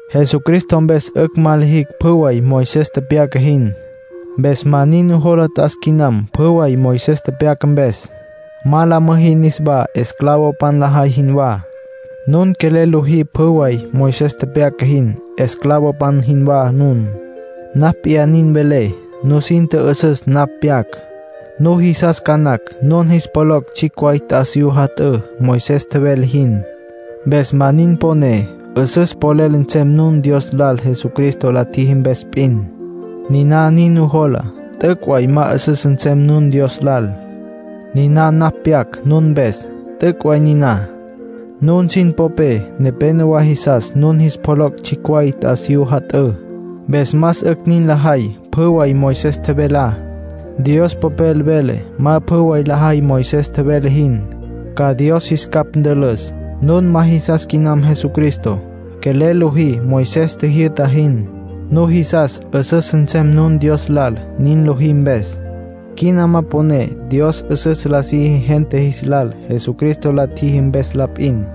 Jesucristo mpes 'ücj ma lijicj pjü way Moisés tepyaca jin. Mpes ma nin nujola t'as quinam pjü way Moisés tepyaca mpes. Ma la müjí niswá esclavopan lajay jinwá. Nun quelel lojí pjü way Moisés tepyaca jin, esclavopan jinwá nun. Napj p'iyá nin velé. Nusin tjü'üsüs napj pyac. Nujisas ca nacj nun jis pjoloc' tsjicj way t'asiyú jat'ǘ, Moisés tjevele jin. Mpes ma nin poné 'üsüs polel nsem nun Dios lal Jesucristo la tjiji mpes p'in. Niná nin nujola, t'üc' way ma 'üsüs nsem nun Dios lal. Niná napj pyac nun mpes, t'üc' way niná. Nun sin popé nepénowa jisas nun jis pjoloc' tsjicj way t'asiyú jat'ǘ. Mpes más 'ücj nin lajay pjü way Moisés tjevelá; Dios Popel vele ma pjü way lajay Moisés tjevele jin, ca Dios jis capj ntülüs. Nun ma jisas quinam Jesucristo. Quelel lojí Moisés tjijyü'ta jin. Nujisas 'üsüs nsem nun Dios lal nin lojí mpes. Quina ma poné Dios 'üsüs la siji gente jis lal Jesucristo la tjiji mpes la p'in.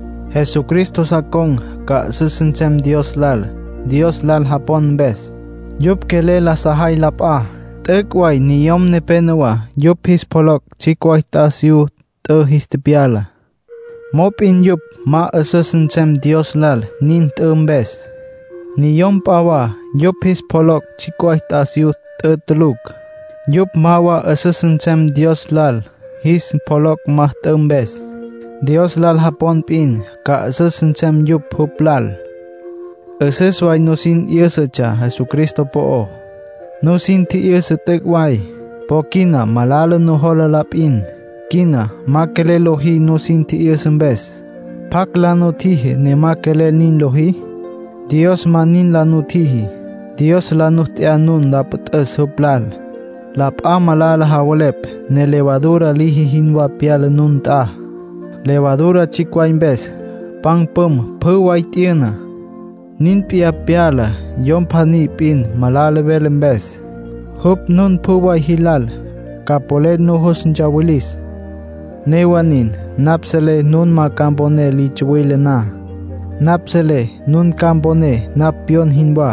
Jesucristo sa con̈ ca 'üsüs nsem Dios lal, Dios lal japon mpes. Yupj quelel la sajay la p'a. T'üc' way niyom nepenowá yupj jis pjoloc' tsjicj way t'asiyú t'ü jis tepyala. Mop'in yupj ma 'üsüs nsem Dios lal nin t'ü mpes. Niyom p'a wa yupj jis pjoloc' tsjicj way t'asiyú t'ü tulucj. Yupj ma wa 'üsüs nsem Dios lal jis pjoloc' ma t'ü mpes. Dios lal japon p'in ca 'üsüs nsem yupj jupj lal. 'Üsüs way nusin 'yǘsatsja Jesucristo po'ó. Nusin tji'yüsa t'üc' way. Po quina malala nujola la p'in. Quina ma quelel lojí nusin tji'yüsa mpes. ¿Pjacj la nutjiji ne ma quelel nin lojí? Dios ma nin la nutjiji. Dios la nu t'ya la püt'üs jupj lal. La p'a malala javelepj, ne levadura liji jinwá pyala nun nt'a. Levadura tsjicj way mpes, pan püm pjü way t'yüna. Nin p'iyá pyala yom pjaní p'in malala vele mpes. Jupj nun pjü way jilal ca polel nujus ntsawilis. Newa nin, napj selé nun ma ca mponé li tsuwile na. Napj selé nun ca mponé napj pyon jinwá.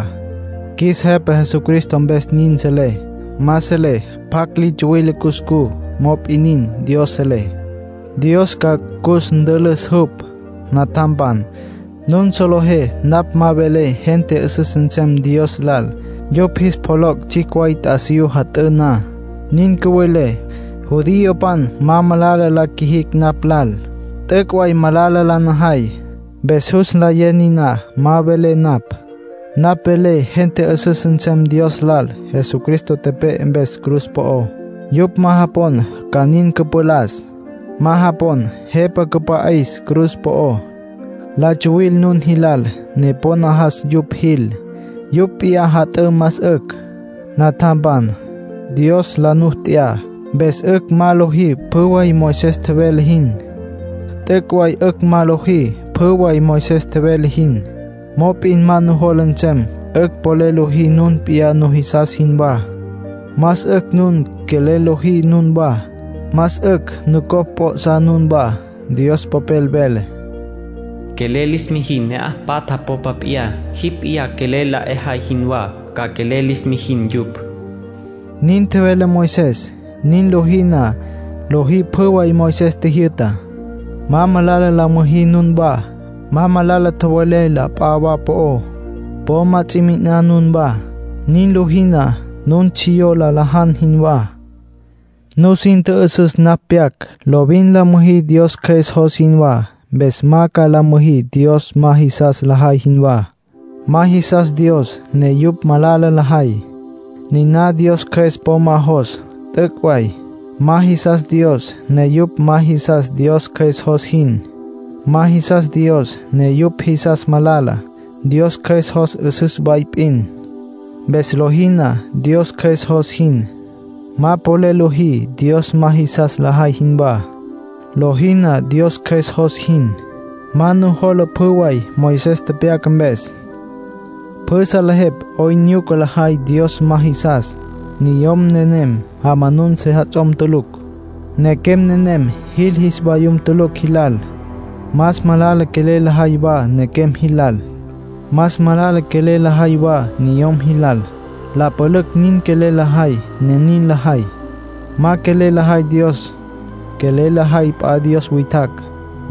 Qjuis Jepa Jesucristo mpes nin selé. Ma selé pjacj li tsuwile cuscú. Mop'in nin, Dios selé; Dios ca cus ntülüs jupj. Natjampan, nun solejé napj ma velé gente 'üsüs nsem Dios lal yupj jis pjoloc' tsjicj way t'asiyú jat'ǘ na. Nin cüvelé, judiopan ma malala la qjuijicj napj lal. T'üc' way malala la najay. Mpes jus nlayé niná ma velé napj. Napj velé gente 'üsüs nsem Dios lal Jesucristo tepe'e mpes cruz po'ó. Yupj ma japon ca nin cüpalas, ma japon jepa cüpa'is cruz po'ó. La tsuwil nun jilal, ne po najas yupj jil; yupj p'iyá jat'ǘ más 'ücj. Natjampan, Dios la nu t'ya, mpes 'ücj ma lojí pjü way Moisés tjevele jin. T'üc' way 'ücj ma lojí pjü way Moisés tjevele jin. Mop'in ma nujola nsem 'ücj polel lojí nun p'iyá nujisas jinwá. Más 'ücj nun quelel lojí nunwá. Más 'ücj nucopj p'o'sá nunwá. Dios Popel vele: “Quelel lis mijin ne'aj patja popa p'iyá. Jipj p'iyá quelel la 'ejay jinwá, ca quelel lis mijin yupj”, nin tjevele Moisés. Nin lojí na, lojí pjü way Moisés tjijyü'tá. Ma malala la müjí nunwá. Ma malala tjowelé la p'a wa po'ó. Po ma ts'i mi'iná nunwá. Nin lojí na, nun tsjiyó la lajan jinwá. Nusin tjü'üsüs napj pyac. Lovin la müjí Dios Cjües jos jinwá. Mpes ma ca la müjí Dios ma jisas lajay jinwá. Ma jisas Dios, ne yupj malala lajay. Niná Dios Cjües po ma jos, t'üc' way. Ma jisas Dios, ne yupj ma jisas Dios Cjües jos jin. Ma jisas Dios, ne yupj jisas malala. Dios Cjües jos 'üsüs way p'in. Mpes lojí na Dios Cjües jos jin, ma polel lojí Dios ma jisas lajay jinwá. Lojí na Dios Cjües jos jin, ma nujola pjü way Moisés tepyaca mpes. Pjü salejepj 'oyn nyuca lajay Dios ma jisas. Niyom nenem jamanun sejats'om tulucj. Nequem nenem jil jis vayum tulucj jilal. Más malala quelel lajay wa nequem jilal. Más malala quelel lajay wa niyom jilal. La pülücj nin quelel lajay, ne nin lajay. Ma quelel lajay Dios. Quelel lajay p'a dios witjacj.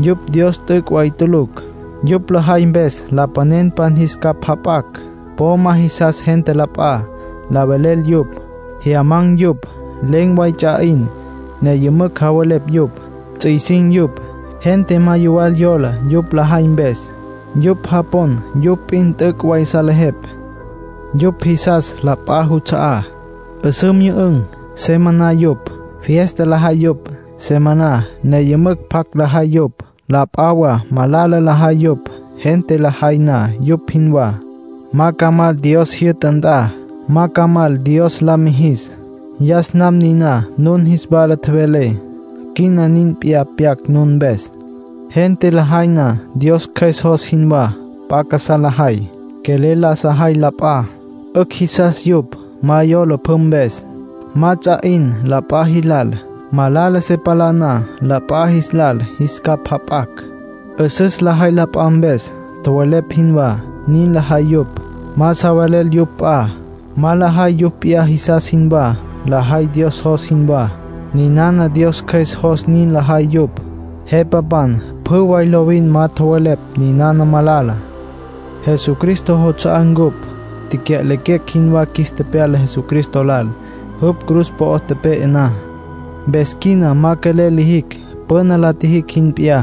Yupj Dios t'üc' way tulucj. Yupj lajay mpes lapanenpan jis capj jap'acj. Po ma jisas gente la p'a. La velel yupj. Jyamanan̈ yupj. Len̈ way ts'a 'in, ne yümücj javelepj yupj. Ts'isin̈ yupj. Gente ma yuwal yola yupj lajay mpes. Yupj japon yupj p'in t'üc' way salejepj. Yupj jisas la p'a juts'a'á. 'Üsǘ myü'ün̈, se maná yupj. Fiesta lajay yupj, se maná, ne yümücj pjac lajay yupj. La p'a wa malala lajay yupj. Gente lajay na yupj jinwá, ma ca mal Dios jyü'ta nt'a. Ma ca mal, Dios la mijis. Yas nam niná nun jis wala tjevelé. Quina nin p'iyá pyac nun mpes. Gente lajay na Dios Cjües jos jinwá, p'a casá lajay. Quelel la sajay la p'a. 'Ücj jisas yupj. Ma yola pjü mpes. Ma ts'a 'in la p'a jilal. Malala se palá na la p'a jis lal, jis capj jap'acj. 'Üsüs lajay la p'a mpes. Tjowelepj jinwá, nin lajay yupj. Ma sa velel yupj p'a. Ma lajay yupj p'iyá jisas jinwá; lajay Dios jos jinwá. Ninana Dios Cjües jos nin lajay yupj. Jepapan pjü way lovin ma tjowelepj ninana malala. Jesucristo juts'a'á ncupj. Tecya'lequecj jinwá qjuis tepyala Jesucristo lal, jupj cruz po'o tepe'e na. Mpes quina ma quelel lijicj püna la tjijicj jin p'iyá.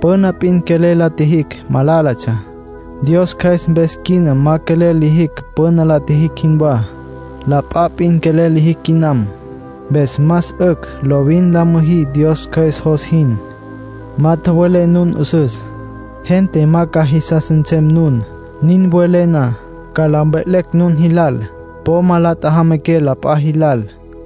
Püna p'in quelel la tjijicj, malálatsja. Dios Cjües mpes quina ma quelel lijicj püna la tjijicj jinwá. La p'a p'in quelel lijicj quinam. Mpes más 'ücj lovin la müjí Dios Cjües jos jin. Ma tjowelé nun 'üsüs. Gente ma ca jisas nsem nun, nin welé na. Ca la mve'lecj nun jilal. Po ma la tjajamanaqué la p'a jilal.